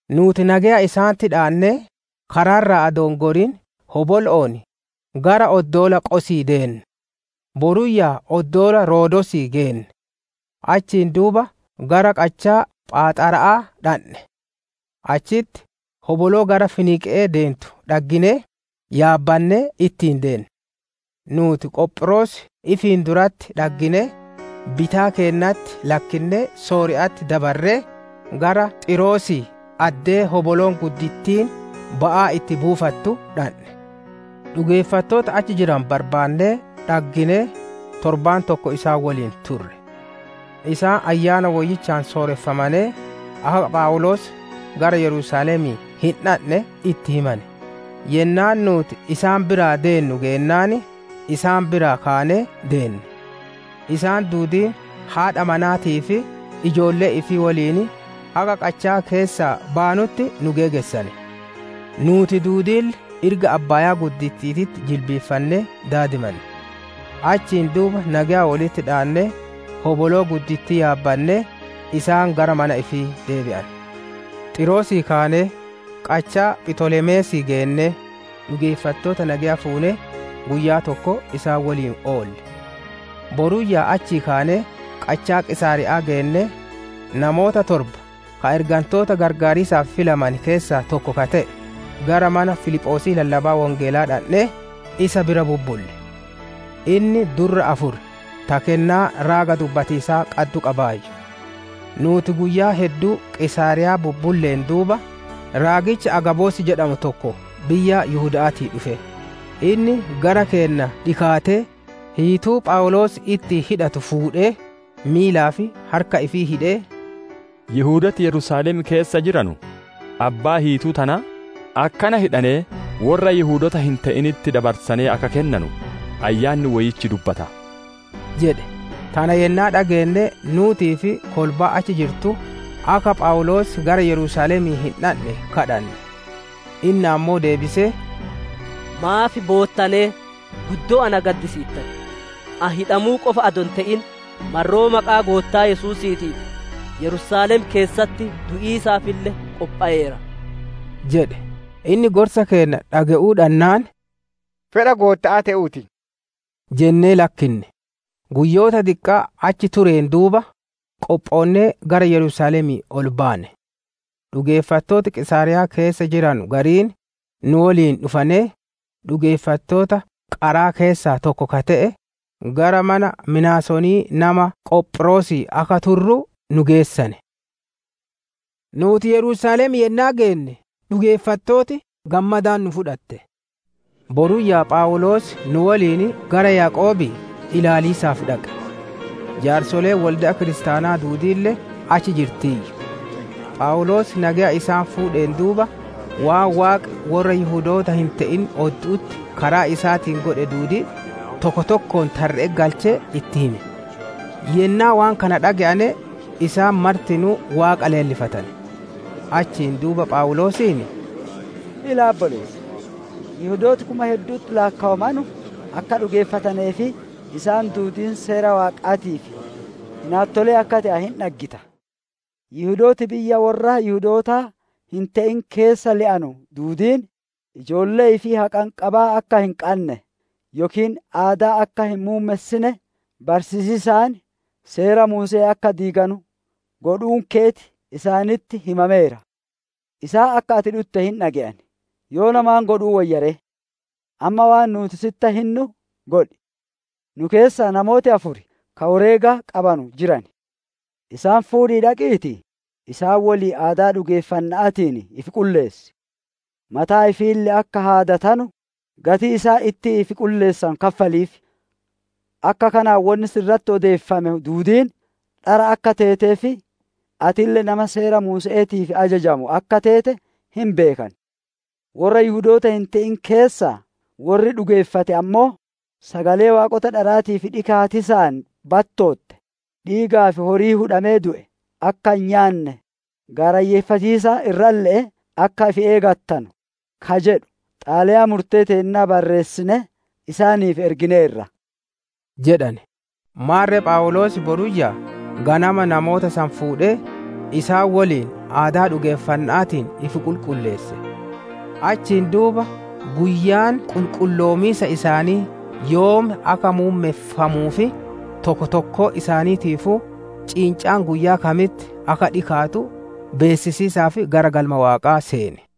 Nuuti nageya isaanitti dhaannee karaa irraa adoo hin gorin hobolo'oon, gara oddoola Qosii deenne; boruyyaa oddoola Roodoosii geenne; achiin duuba gara qachaa phaaxara'aa dhandhe. Achitti hoboloo gara Finiiqe'ee deentu dhagginee, yaabbannee ittiin deenne. Nuuti Qophiroos ifiin duratti dhagginee, bitaa keennatti lakkinnee Sooriya'atti dabarree, gara Xiiroosii addee hoboloon guddittiin ba'aa itti buufattu dhandhe. Dhugeeffattoota achi jiranu barbaannee dhagginee, torbaan tokko isaan woliin turre. Isaan Ayyaana Woyyichaan sooreffamanee, akka Phawuloos gara Yerusaalemii hin dhandhe itti himane. Yennaan nuuti isaan biraa deennu geennaan, isaan biraa kaanee deenne. Isaan duudiin haadha manaatii fi ijoollee ifii woliin haga qachaa keessaa baanutti nu geegessane. Nuuti duudiille irga abbaaya'aa jilbiiffannee daadimanne. Achiin duuba nageya wolitti dhaannee, hoboloo guddittii yaabbannee, isaan gara mana ifii deebi'ane. Xiiroosii kaanee, qachaa Phitolemeesii geennee, dhugeeffattoota nageya fuunee, guyyaa tokko isaan woliin oolle. Boruyyaa achii kaanee qachaa Qiisaariya'aa geennee, namoota torba ka ergantoota qarqaariisaaf filamane keessaa tokko ka te'e, gara mana Filiphoosii lallabaa Wongeelaa dhandhee, isa bira bubbulle. Inni durra afur ta kennaa raaga dubbatiisaa qaddu qabaayyu. Nuuti guyyaa hedduu Qiisaariyaa bubbulleen duuba, raagichi Agaabos jedhamu tokko biyya Yihuda'aatii dhufe. Inni gara keenna dhikaatee, hiituu Phawuloos ittiin hidhatu fuudhee, miilaa fi harka ifii hidhee, «Yihudooti Yerusaalem keessa jiranu, abbaa hiituu tanaa, akkana hidhanee worra Yihudoota hin te'initti dabarsanee akka kennanu, Ayyaanni Woyyichi dubbata» jedhe. Tana yennaa dhageenne, nuutii fi kolbaan achi jirtu, akka Phawuloos gara Yerusaalemii hin dhandhe kadhanne. Inni ammoo deebisee, «Maaf boottanee, guddoo na gaddisiittan? Ani hidhamuu qofa adoo hin ite'in, marroo maqaa Goottaa Yesuusiitiif Yerusaalem keessatti du'iisaafille qophoweera» jedhe. Inni gorsa keenna dhage'uu dhannaan, «Fedha Gootta'aa te'uu ti» jennee lakkinne. Guyyoota diqqaa achi tureen duuba, qophoonnee gara Yerusaalemii ol baane. Dhugeeffattooti Qiisaariyaa keessa jiranu gariin, nu woliin dhufanee, dhugeeffattoota qaraa keessaa tokko ka te'e, gara mana Minaasonii nama Qophiroosii akka turru nu geessane. Nuuti Yerusaalem yennaa geenne, dhugeeffattooti gammadaan nu fudhatte. Boruyyaa Phawuloos nu woliin gara Yaaqoobii ilaaliisaaf dhaqe; jaarsoleen wolde'a kiristaanaa duudiille achi jirtiiyyu. Phawuloos nageya isaan fuudheen duuba, waan Waaqi worra Yihudoota hin te'in oddu'utti karaa isaatiin godhe duudii, tokko tokkoon tarre'etti galchee itti hime. Yennaa waan kana dhage'ane, isaan martinuu Waaqa leellifatane. Achiin duuba Phawuloosiin, «Ilaa obboleessa! Yihudooti kuma heddu'utti laakkowamanu akka dhugeeffatanee fi isaan duudiin seera Waaqaatiif hinaattolee akka te'ane hin dhaggita. Yihudooti biyya worra Yihudootaa hin te'in keessa le'anu duudiin, ijoollee ifii haqanqabaa akka hin qanne yookiin aadaa akka hin muummessine barsiisiisaan Seera Muuse'ee akka diiganu godhuun keeti isaanitti himameera. Isaan akka ati dhutte hin dhage'an; yoona maan godhuu woyya ree? Amma waan nuuti sitti hinnu godhi! Nu keessa namooti afur ka woreega qabanu jiran. Isaan fuudhii dhaqiitii, isaan woliin aadaa dhugeeffanna'aatiin ifi qulleessi; mataa ifiille akka haadatanu, gatii isaan ittiin ifi qulleessanu kaffaliif. Akka kanaan wonni si irratti odeeffame duudiin dhara akka teetee fi atille nama Seera Muuse'eetiif ajajamu akka teete hin beekan. Worra Yihudoota hin te'in keessaa worri dhugeeffate ammoo, sagalee waaqota dharaatiif dhikaatiisaan battootte, dhiigaa fi horii hudhamee du'e akka hin nyaanne, gaarayyeeffatiisa irralle'ee akka ifi eegattanu, ka jedhu xalayaa murtee teennaa barreessinee isaaniif ergineerra» jedhane. Maarre Phawuloos boruyyaa ganama namoota san fuudhee, isaan woliin aadaa dhugeeffanna'aatiin ifi qulqulleesse; achiin duuba guyyaan qulqulloomiisa isaanii yoom akka muummeffamuu fi tokko tokkoo isaaniitiifuu, ciincaan guyyaa kamitti akka dhikaatu beessisiisaaf gara Galma Waaqaa seene.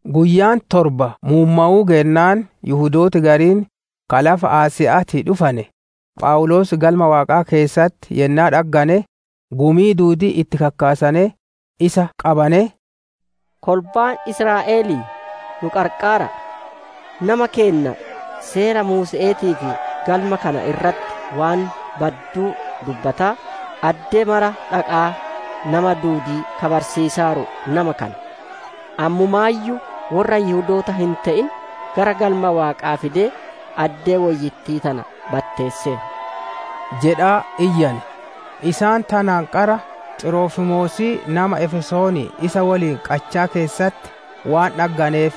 Guyyaan torba muummowuu geennaan, Yihudooti gariin ka lafa Asiya'aatii dhufane, Phawuloos Galma Waaqaa keessatti yennaa dhaggane, gumii duudii itti kakkaasanee, isa qabanee, «Kolbaa Israa'elii, nu qarqaara'a! Nama keenna, Seera Muuse'eetii fi Galma kana irratti waan badduu dubbataa, addee mara dhaqaa nama duudii ka barsiisaaru nama kana. Ammumaayyuu worra Yihudoota hin te'in, gara Galma Waaqaa fidee, addee woyyittii tana batteesseera» jedhaa iyyane. Isaan tanaan qara Xirofimoosii nama biyya Efesoonii isa woliin qachaa keessatti waan dhagganeef,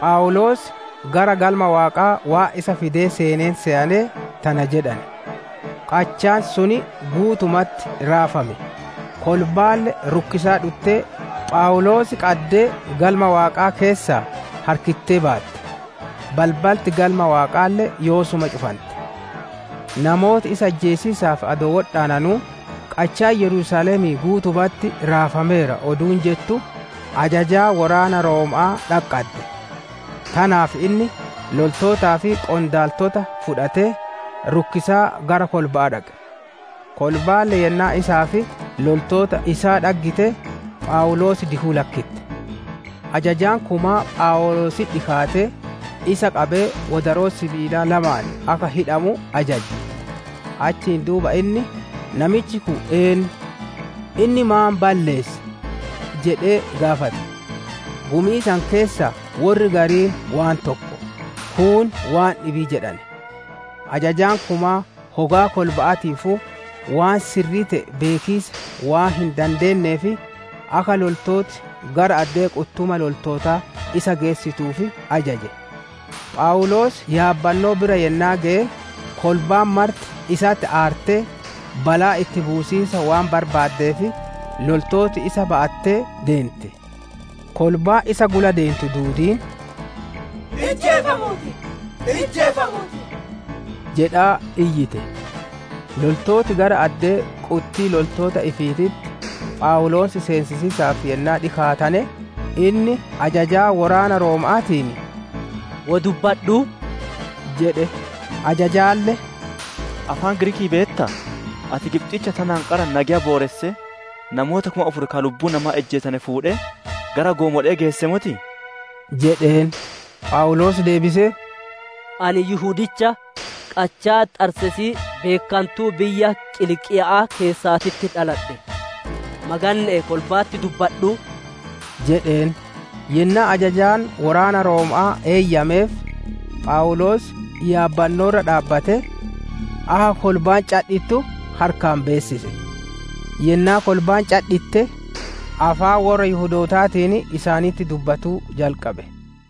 Phawuloos gara Galma Waaqaa waan isa fidee seeneen seyanee, tana jedhane. Qachaan sun guutumatti raafame; kolbaalle rukkisaa dhuttee, Phawuloos qaddee Galma Waaqaa keessaa harkittee baatte; balbalti Galma Waaqaalle yoosuma cufante. Namooti isa ijjeesiisaaf adoo wodhaananuu, «Qachaan Yerusaalemii guutumatti raafameera» oduun jettu, ajajaa woraana Rooma'aa dhaqqadde. Tanaaf inni loltootaa fi qondaaltotaa fudhatee, rukkisaa gara kolba'aa dhaqe; kolbaalle yennaa isaa fi loltoota isaa dhaggite, Phawuloos dikuu lakkitte. Ajajaan kumaa Phawuloositti dhikaatee, isa qabee wodaroo sibiilaa lamaan akka hidhamu ajaje. Achiin duuba inni, «Namichi kun eennu? Inni maan balleesse?» jedhee gaafate. Gumii san keessaa worri gariin waan tokko, kuun waan dhibii jedhane. Ajajaan kumaa hogaa kolba'aatiifuu, waan sirrii te'e beekiisa waan hin dandeenneef, akka loltooti gara addee quttuma loltootaa isa geessituuf ajaje. Phawuloos yaabbannoo bira yennaa geye, kolbaan marti isatti aartee, balaa itti buusiisa waan barbaaddeef, loltooti isa ba'attee deente. Kolbaan isaan gula deentu duudiin, «Ijjeefamuu ti!» jedhaa iyyite. Loltooti gara addee quttii loltoota ifiititti, Phawuloos seensisiisaaf yennaa dhikaatane, inni ajajaa woraana Rooma'aatiin, «Wo dubbadhuu?» jedhe. Ajajaalle, «Afaan Giriikii beettaa? Ati Gibxicha tanaan qara nageya booressee, namoota kuma afur ka lubbuu namaa ijjeesane fuudhee, gara goomole'ee geessee motii?» jedheen. Phawuloos deebisee, «Ani Yihudicha, qachaa Xarseesii beekkantuu biyya Qiliiqiya'aa keessatti dhaladhe; maganne'ee kolba'atti dubbadhuu?» jedheen. Yennaa ajajaan woraana Rooma'aa eeyyameef, Phawuloos yaabbannoo irra dhaabbatee, akka kolbaan cadhittu harkaan beessise; yennaa kolbaan cadhitte, afaan worra Yihudootaatiin isaanitti dubbatuu jalqabe.